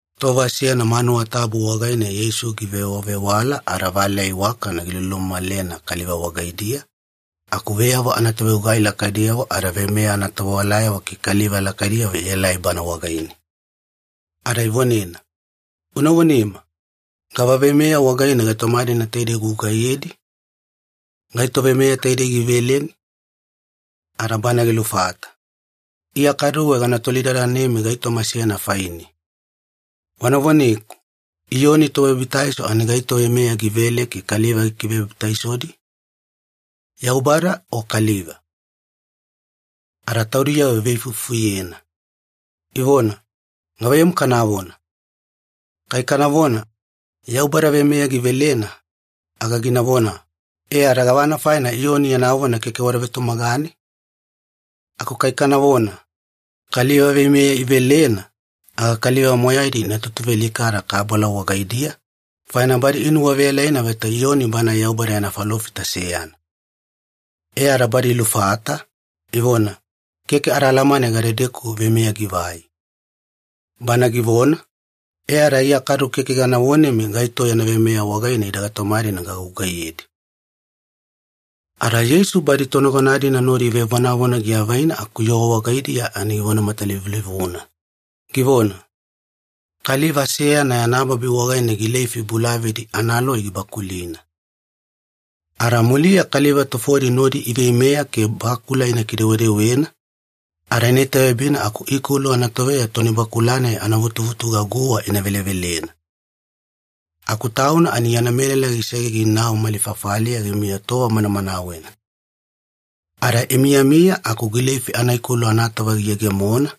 Tova seyana manuwa tabu wagaine Yeisu givewavewala ada valeya iwakana gilulumamalena kaliva wagaidiya, aku veyavo anatovegugai lakaidiyavo ada veimeya anatovewalayavo ke kaliva lakaidiyavo ielai Bana wagaine. Ada ivonena, “Una vonema, gava veimeya wagaine gaitoma-dina taidei ugugaiyedi? Gaito veimeya taidei giveleni?” Ada Banae gilufata, “Iya kaduwe gana tolidadanemi gaitoma seyana faine. Wana voneku, Iyoni Tobabitaiso ani gaito veimeya givele ke kaliva gikivebabitaisodi? Yaubada o kaliva?” Ada taudiyavo iveifuifufuyena, ivona, “Gavaiyamu kanavona? Kai kanavona, ‘Yaubada veimeya givelena,’ aga ginavona, ‘E ada gavana faina Iyoni yana vona keke wada vetumagane?’ Aku kai kanavona, ‘Kaliva veimeya ivelena,’ aga kaliva moyaidi ina tutuvealikada kabala wagaidiya, faina badi inuwaveyalaina vaita Iyoni banae Yaubada yana falofita seyana.” E ada badi ilufata, ivona, “Keke ada alamane gadedeku veimeya givai.” Bana givona, “E ada Iya kadu keke gana vonemi gaito yana veimeya wagaine ida gaitoma-dina gagugaiyedi.” Ada Yeisu badi tonagona-dina nodi ivevonavona giavaina aku yoo wagaidiya ani givona matalivulivuna, givona, “Kaliva seyana yana babi wagaine gileifi bulavadi analoi gibakulina. Ada muliya kaliva tufodi nodi iveimeya ke bakula ina kidewedewena, ada ina itaveyabina aku ikolu anatoveya toni bakula-nai anavutuvutuga guwa ina velevelena. Aku tauna ani yana melala gisege ginau mali fafaliya gimiya tova manamanawena. Ada imiyami aku gileifi anaikolu anatova giyegemona,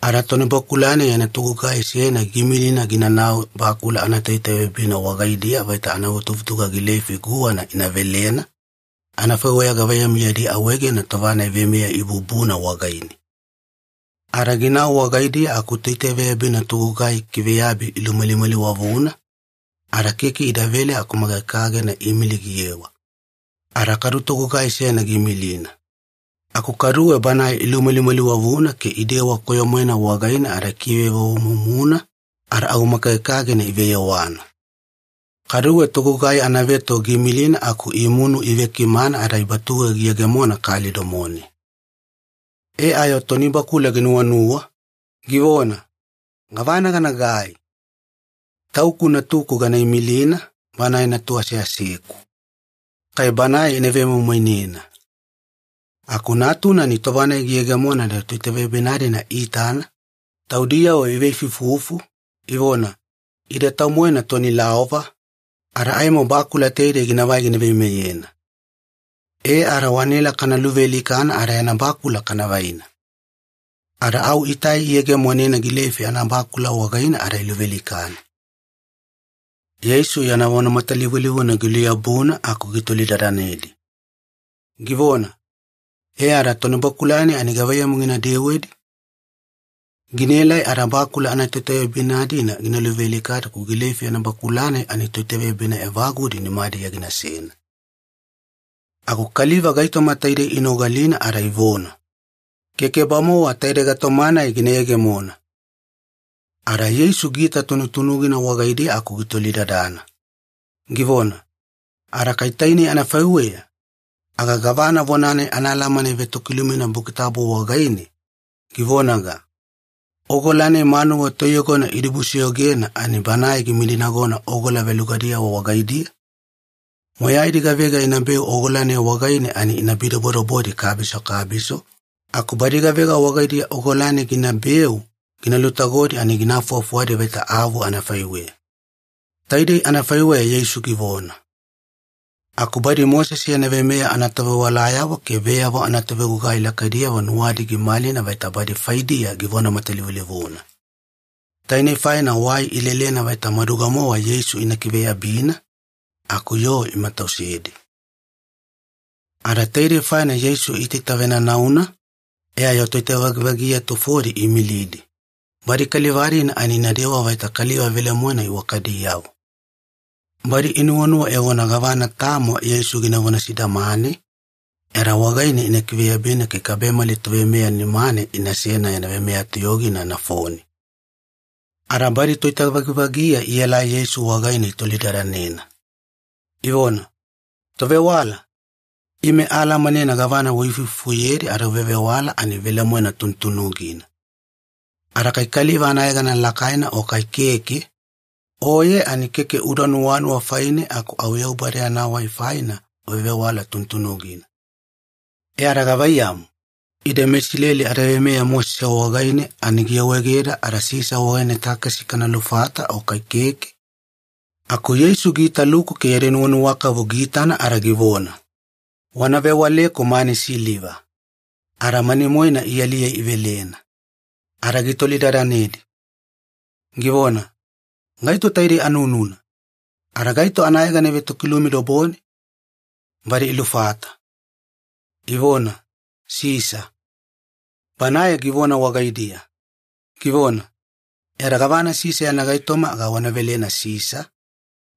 ada tonibakula-nai yana togugai seyana giimilina ginanau bakula anatoitaveyabina wagaidiya vaita anavutuvutuga gileifi guwana ina velena, anafaiweya gavaiyamu yadi awaegena tova-nai veimeya ibubuna wagaine. Ada ginau wagaidiya aku toitaveyabina togugai ikiveyabi ilumalimaliwavuna, ada keke idavele aku makagekagena iimili giyewa. Ada kadu togugai seyana giimilina. Aku kaduwe banae ilumalimaliwavuna ke idewa koyo-moena wagaine ada ikivevovomumuna, ada au makagekagena iveyewana. Kaduwe togugai anaveto giimilina aku imunu iivekimana ada ibatuge giyegemona kali domone. “E ayo tonibakula ginuwanuwa, givona, ‘Gavana ganagai? Tauku natuku gana imilina, banae natu aseaseku. Kai banae ina vemoimoinena.’ “Aku natuna ani tova-nai giyegemona ada toitaveyabina-dina iitana, taudiyavo iveifuifufu, ivona, ‘Ida tau-moena toni laova, ada aimo bakula taidei ginavai gina veimeyena. E ada wanaela kana luvealikana ada yana bakula kana vaina.’ Ada au itai iyegemonena gileifi anabakula wagaine ada iluvealikana.” Yeisu yana vona matalivulivuna giluyabuna aku gitolidadanedi, givona, “E ada tonibakula-nai ani gavaiyamu gina dewedi? Ginaelai ada bakula toitaveyabina-dina gina luvealikadi aku gileifi anabakula-nai ani toitaveyabina evagudi nimadiya ginasena.” Aku kaliva gaitoma taidei inogalina ada ivona, “Keke-bamowa taide gaitoma-nai gina yegemona!” Ada Yeisu giita tunutunugina wagaidiya aku gitolidadana, givona, “Ada kai tainei anafaiweya, aga gavana vona-nai anaalamana ivetokilumina Buki Tabu wagaine, givonaga, ‘Ogola-nai manuwa toiyogona idibusoyogena ani banae gimidinagona ogola velugadiyavo wagaidiya’? Moyaidi gavega inabeu ogola-nai wagaine ani ina bidobodobodi kabiso kabiso, aku badi gavega wagaidiya ogola-nai ginabeu gina lutagodi ani gina lufuwafuwadi vaita avu anafaiweya.” Taidei anafaiweya Yeisu givona. Aku badi Mosese yana veimeya anatovewalayavo ke veyavo anatovegugai lakaidiyavo nuwadi gimalina vaita badi faidiya givona matalivulivuna. Tainei faina wai ilelena vaita maduga-mowa Yeisu ina kiveyabina, aku yoo imatausedi. Ada taidei faina Yeisu iitaita venanauna, e ayo toitavagivagiya tufodi iimilidi, badi kaliva-dina ani inadewa vaita kaliva velemoena iwakadiyavo. Badi inuwanuwa evona gavana tamo Yeisu ginavona sidamane, e ada wagaine ina kiveyabina ke kabemali toveimeya nimane inasena yana veimeya toyogina nafone. Ada badi toitavagivagiya ielai Yeisu wagaine itolidadanena, ivona, “Tovewala, ime aalamanena gavana uifuifufuyedi ada uvevewala ani velemoena tunutunugina. Ada kai kaliva anayegana lakaina o kai keke, Oye ani keke uda nuwanuwa faine aku au Yaubada yana wai faina uvevewala tunutunugina. E ada gavaiyamu, ide meIsileli adaveimeya Mosese wagaine ani giawaegeda ada Sisa wagaine takesi kana lufata o kai keke?” Aku Yeisu giitaluku ke yadi nuwanuwakavu giitana ada givona, “Wana vewaleku mani siliva.” Ada mani-moena ialiye ivelena. Ada gitolidadanedi, givona, “Gaito taidei anununa? Ada gaito anayegana ivetokilumi dobone?” Badi ilufata, ivona, “Sisa.” Banae givona wagaidiya, givona, “E ada gavana Sisa yana gaitoma aga wana velena Sisa,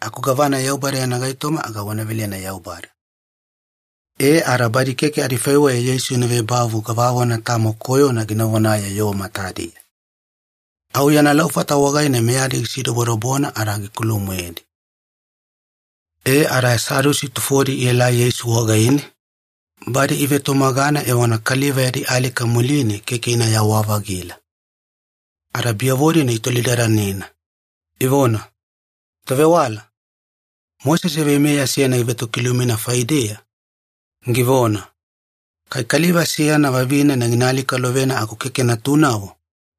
aku gavana Yaubada yana gaitoma aga wana velena Yaubada.” E ada badi keke adifaiweya Yeisu ina vebavu gavavona tamo koyona gina vonaye yoo matadiya. Au yana laufata wagaine meyadi gisidobodobona ada gikulu-moedi. E ada Sadusi tufodi ielai Yeisu wagaine, badi ivetumagana evona kaliva yadi alika muline keke inayawa-vagila. Ada biyavo-dina itolidadanena, ivona, “Tovewala, Mosese veimeya seyana givetokilumina faideya, givona, ‘Kai kaliva seyana vavinena gina alikalovena aku keke natunavo,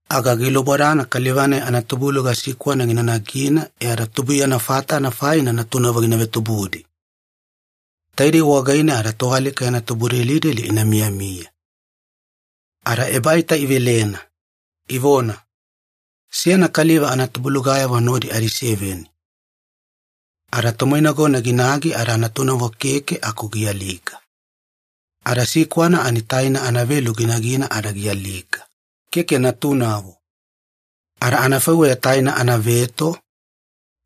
aga gilubodana kaliva-nai anatubuluga sikwana gina nagina e ada tubuiyana fatana faina natunavo gina vetubudi. Taidei wagaine ada toalika yana tubudelideli ina miyamiya.’” Ada ebaita ivelena, ivona, “Seyana kaliva anatubulugayavo nodi adiseveni. Ada tomoinagona ginagi ada natunavo keke aku gialika. Ada sikwana ani taina anavelu ginagina ada gialika, keke natunavo. Ada anafaiweya taina anaveto,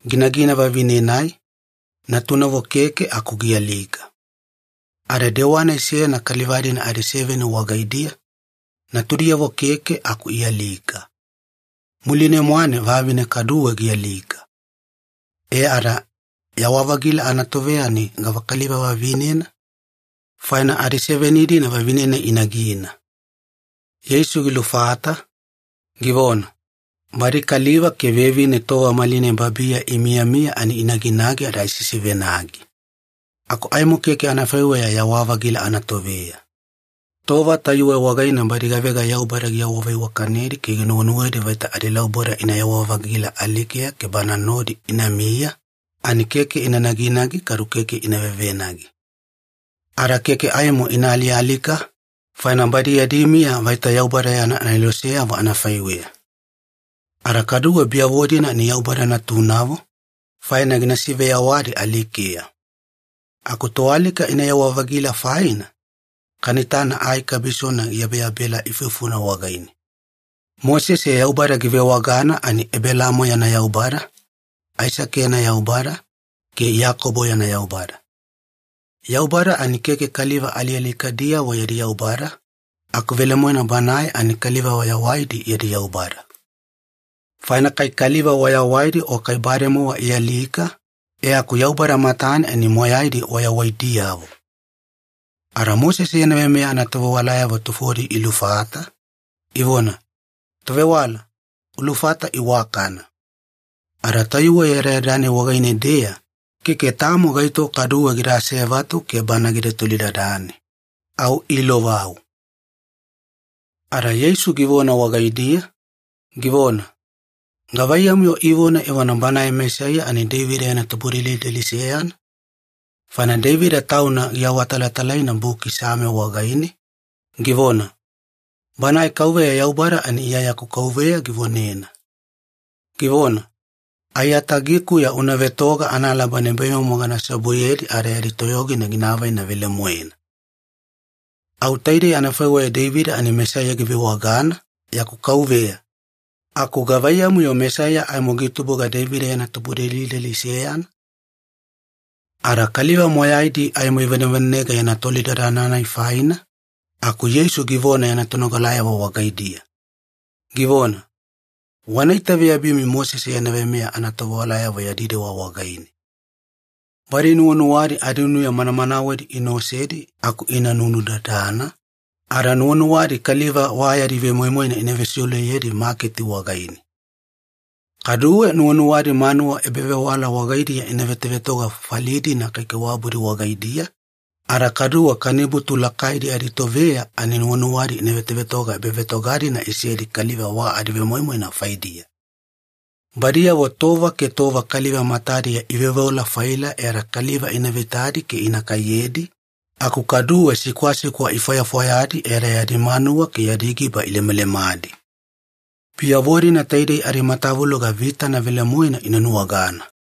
ginagina vavine-nai, natunavo keke aku gialika. Ada dewa-nai seyana kaliva-dina adiseveni wagaidiya, natudiyavo keke aku ialika. Muline-mwane vavine kaduwe gialika. E ada, yawa-vagila anatoveya ani gavakaliva vavinena? Faina adiseveni-dina vavine-nai inagina.” Yeisu gilufata, givona, “Badi kaliva ke vevine tova malinai babiya imiyamiya ani inaginagi ada isisivenagi. Aku aimo keke anafaiweya yawa-vagila anatoveya. Tova tayuwe wagaine badi gavega Yaubada giawaveiwakanedi ke ginuwenuwedi vaita adilauboda inayawa-vagila alikeya ke Banae nodi inamiya, ani keke ina naginagi kadu keke ina vevenagi. Ada keke aimo ina alialika, faina badi yadi miya vaita Yaubada yana aneloseyavo anafaiweya. Ada kaduwe biyavo-dina ani Yaubada natunavo, faina gina siveyawadi alikeya. Aku toalika inayawa-vagila faina, kana itana ai kabisona giyabeyabela ifufuna wagaine. Mosese Yaubada givewagana ani ‘Ebelaamo yana Yaubada, Aisake yana Yaubada, ke Iyakobo yana Yaubada.’ Yaubada ani keke kaliva alialikadiyavo yadi Yaubada, aku velemoena Banae ani kaliva wayawaidi yadi Yaubada. Faina kai kaliva wayawaidi o kai bademowa ialika, e aku Yaubada matane ani moyaidi wayawaidiyavo.” Ada Mosese yana veimeya anatovewalayavo tufodi ilufata, ivona, “Tovewala, ulufata iwakana.” Ada tayuwe yadayada-nai wagaine-deya, keke tamo gaito kaduwe gida asevatu ke Bana gida tolidadane. Au iilovau. Ada Yeisu givona wagaidiya, givona, “Gavaiyamu-yo ivona evona Banae Mesaiya ani Deivida yana tubudelideli seyana? Faina Deivida tauna giawatalatalaina Buki Same wagaine, givona, ‘Banae KAUVEYA Yaubada ani Iya yaku Kauveya givonena, givona, “Aiyatagikuya una vetoga analaba nibaimomo gana seobuyedi ada yadi toyogina gina avaina velemoena.”; Au taidei anafaiweya Deivida ani Mesaiya givewagana ‘yaku Kauveya’, aku gavaiyamu-yo Mesaiya aimo gitubuga Deivida yana tubudelideli seyana?” Ada kaliva moyaidi aimo ivanevanenega yana tolidadana-nai faina, aku Yeisu givona yana tonogalayavo wagaidiya, givona, “Wana itaveyabimi Mosese yana veimeya anatovewalayavo yadi dewa wagaine. Badi nuwanuwadi adinuya manamanawedi ina osedi aku ina nunudadana, ada nuwanuwadi kaliva wa yadi vemoimoina ina vesiuleyedi maketi wagaine. Kaduwe nuwanuwadi manuwa ebavewala wagaidiya ina vetovetoga fafali-dina kaikaiwabudi wagaidiya, ada kaduwe kanibutu lakaidi aditoveya ani nuwanuwadi ina vetovetoga ebavetoga-dina isedi kaliva wa adivemoimoina faidiya. Badiyavo tova ke tova kaliva matadiya iveoveola-faila e ada kaliva ina veitadi ke ina kaiyedi, aku kaduwe sikwasikwa ifwayafwayadi e ada yadi manuwa ke yadi giba ilemalemadi. Biyavo-dina taidei adimatavuloga vitana velemoena ina nuwagana.”